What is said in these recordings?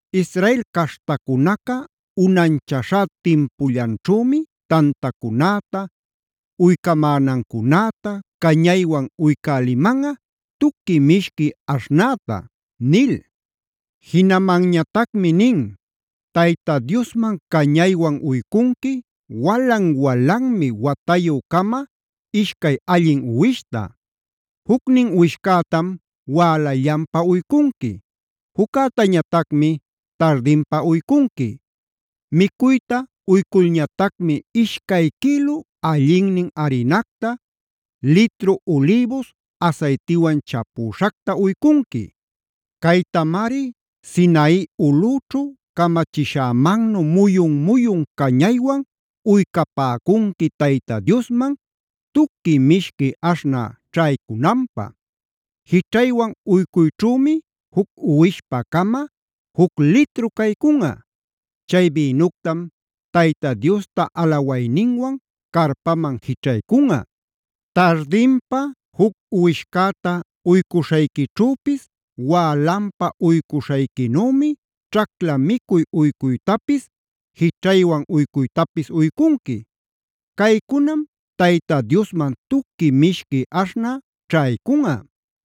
“Israel caśhtacunaca unanchaśhá timpullanćhümi tantacunäta, uycamänancunäta, cañaywan uycälimanꞌa tuqui mishqui aśhnäta” nil. Jinamanñatacmi nin: “Tayta Diosman cañaywan uycunqui walan-walanmi watayü-cama ishcay allin uwishta. Jucnin uwishcätam wälallanpa uycunqui; juccätañatacmi tardinpa uycunqui. Micuyta uyculñatacmi ishcay quïlu allinnin arinacta, litru ulïbus asaytiwan chapüśhacta uycunqui. Caytamari Sinai ulꞌüćhu camachishämannu muyun-muyun cañaywan uycapäcunqui Tayta Diosman tuqui mishqui aśhnä ćhaycunanpä. Jićhaywan uycuyćhümi juc uwishpä-cama juc litru caycunꞌa. Chay bïnuctam Tayta Diosta alawayninwan carpaman jićhaycunꞌa. Tardinpa juc uwishcäta uycuśhayquićhüpis wälanpa uycuśhayquinümi ćhacla micuy uycuytapis jićhaywan uycuytapis uycunqui. Caycunam Tayta Diosman tuqui mishqui aśhnä ćhaycunꞌa.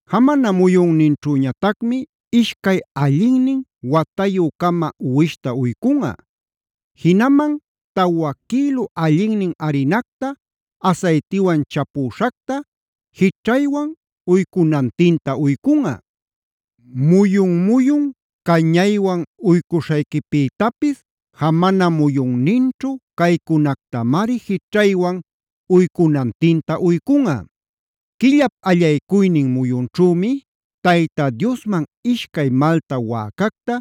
“Jamana muyunninćhüñatacmi ishcay allinnin watayü-cama uwishta uycunꞌa. Jinaman tawa quïlu allinnin arinacta asaytiwan chapüśhacta, jićhaywan uycunantinta uycunꞌa. Muyun-muyun cañaywan uycuśhayquipïtapis jamana muyunninćhu caycunactamari jićhaywan uycunantinta uycunꞌa.a “Quillap allaycuynin muyunćhümi Tayta Diosman ishcay malta wäcacta,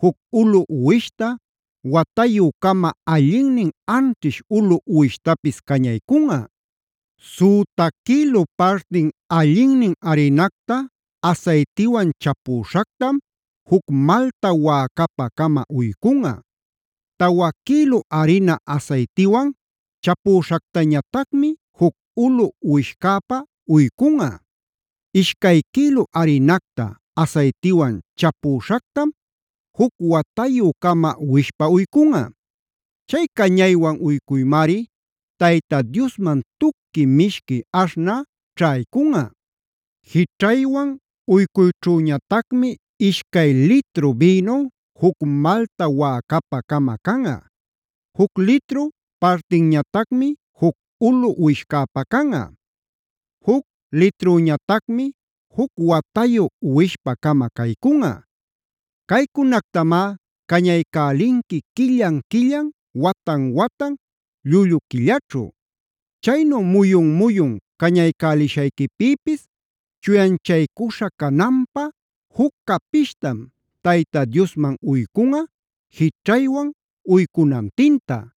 juc ulu uwishta, watayü-cama allinnin anćhish ulu uwishtapis cañaycunꞌa. Süta quïlu partin allinnin arinacta asaytiwan chapüśhactam juc malta wäcapä-cama uycunꞌa. Tawa quïlu arina asaytiwan chapüśhactañatacmi juc ulu uwishcäpä uycunꞌa. Ishcay quïlu arinacta asaytiwan chapüśhactam juc watayü-cama uwishpä uycunꞌa. Chay cañaywan uycuymari Tayta Diosman tuqui mishqui aśhnä ćhaycunꞌa. Jićhaywan uycuyćhüñatacmi ishcay litru bïnu, juc malta wäcapä-cama canꞌa. Juc litru partinñatacmi juc ulu uwishcäpä canꞌa. Juc litrüñatacmi juc watayu uwishpä-cama caycunꞌa. Caycunactamá cañaycälinqui quillan-quillan, watan-watan, llullu quillaćhu. Chaynu muyun-muyun cañaycälishayquipïpis, chuyanchaycuśha cananpä juc capishtam Tayta Diosman uycunꞌa jićhaywan uycunantinta.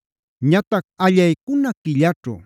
“Ñatac allaycuna quillaćhu,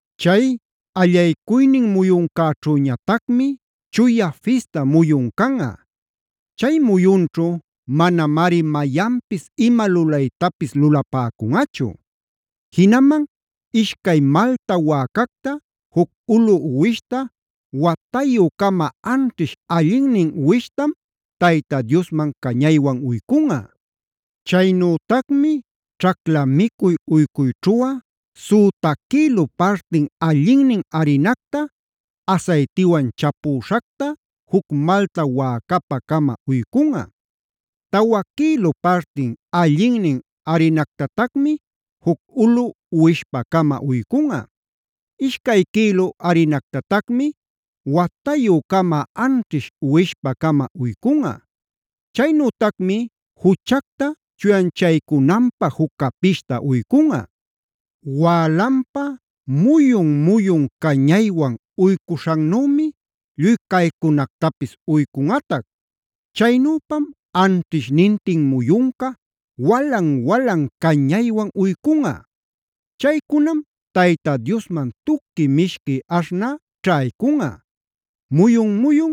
Chay allaycuynin muyuncäćhüñatacmi chuya fista muyun canꞌa. Chay muyunćhu manamari mayanpis ima lulaytapis lulapäcunꞌachu. Jinaman ishcay malta wäcacta, juc ulu uwishta, watayü-cama anćhish allinnin uwishtam Tayta Diosman cañaywan uycunꞌa. Chaynütacmi ćhacla micuy uycuyćhuꞌa: süta quïlu partin allinnin arinacta asaytiwan chapüśhacta juc malta wäcapä-cama uycunꞌa. Tawa quïlu partin allinnin arinactatacmi juc ulu uwishpä-cama uycunꞌa. Ishcay quïlu arinactatacmi watayü-cama anćhish uwishpä-cama uycunꞌa. Chaynütacmi juchacta chuyanchaycunanpä juc capishta uycunꞌa. Wälanpa muyun-muyun cañaywan uycuśhannümi lluy caycunactapis uycunꞌatac. Chaynüpam anćhishnintin muyunca walan-walan cañaywan uycunꞌa. Chaycunam Tayta Diosman tuqui mishqui aśhnä ćhaycunꞌa. Muyun-muyun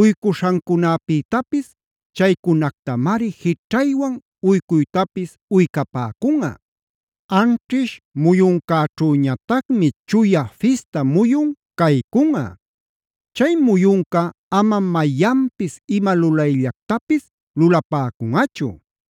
uycuśhancunapïtapis chaycunactamari jićhaywan uycuytapis uycapäcunꞌa. Anćhish muyuncäćhüñatacmi chuya fista muyun caycunꞌa. Chay muyunca amam mayanpis ima lulayllactapis lulapäcunꞌachu.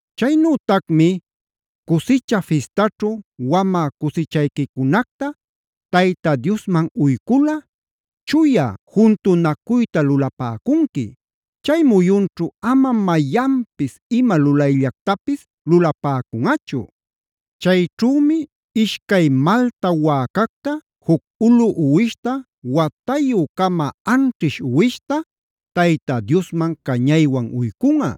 “Chaynütacmi ‘Cusicha Fistaćhu’d wamä cusichayquicunacta Tayta Diosman uyculꞌa chuya juntunacuyta lulapäcunqui. Chay muyunćhu aman mayanpis ima lulayllactapis lulapäcunꞌachu. Chayćhümi ishcay malta wäcacta juc ulu uwishta, watayü-cama anćhish uwishta Tayta Diosman cañaywan uycunꞌa.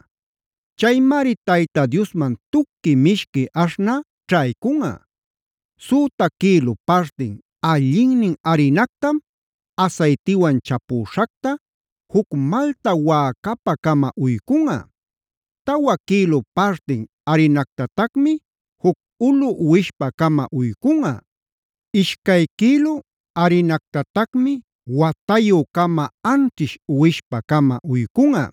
Chaymari Tayta Diosman tuqui mishqui aśhnä ćhaycunꞌa. Süta quïlu partin allinnin arinactam asaytiwan chapüśhacta juc malta wäcapä-cama uycunꞌa. Tawa quïlu partin arinactatacmi juc ulu uwishpä-cama uycunꞌa. Ishcay quïlu arinactatacmi watayü-cama anćhish uwishpä-cama uycunꞌa.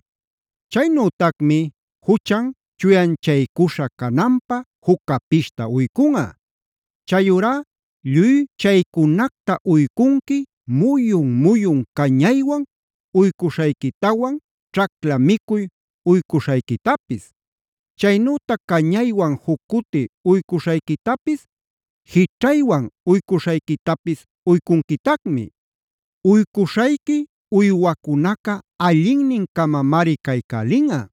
Chaynütacmi juchan chuyanchaycuśha cananpä juc capishta uycunꞌa. Chayurá lluy chaycunacta uycunqui muyun-muyun cañaywan uycuśhayquitawan, ćhacla micuy uycuśhayquitapis; chaynütac cañaywan juc cuti uycuśhayquitapis jićhaywan uycuśhayquitapis uycunquitacmi. Uycuśhayqui uywacunaca allinnin-camamari caycälinꞌa.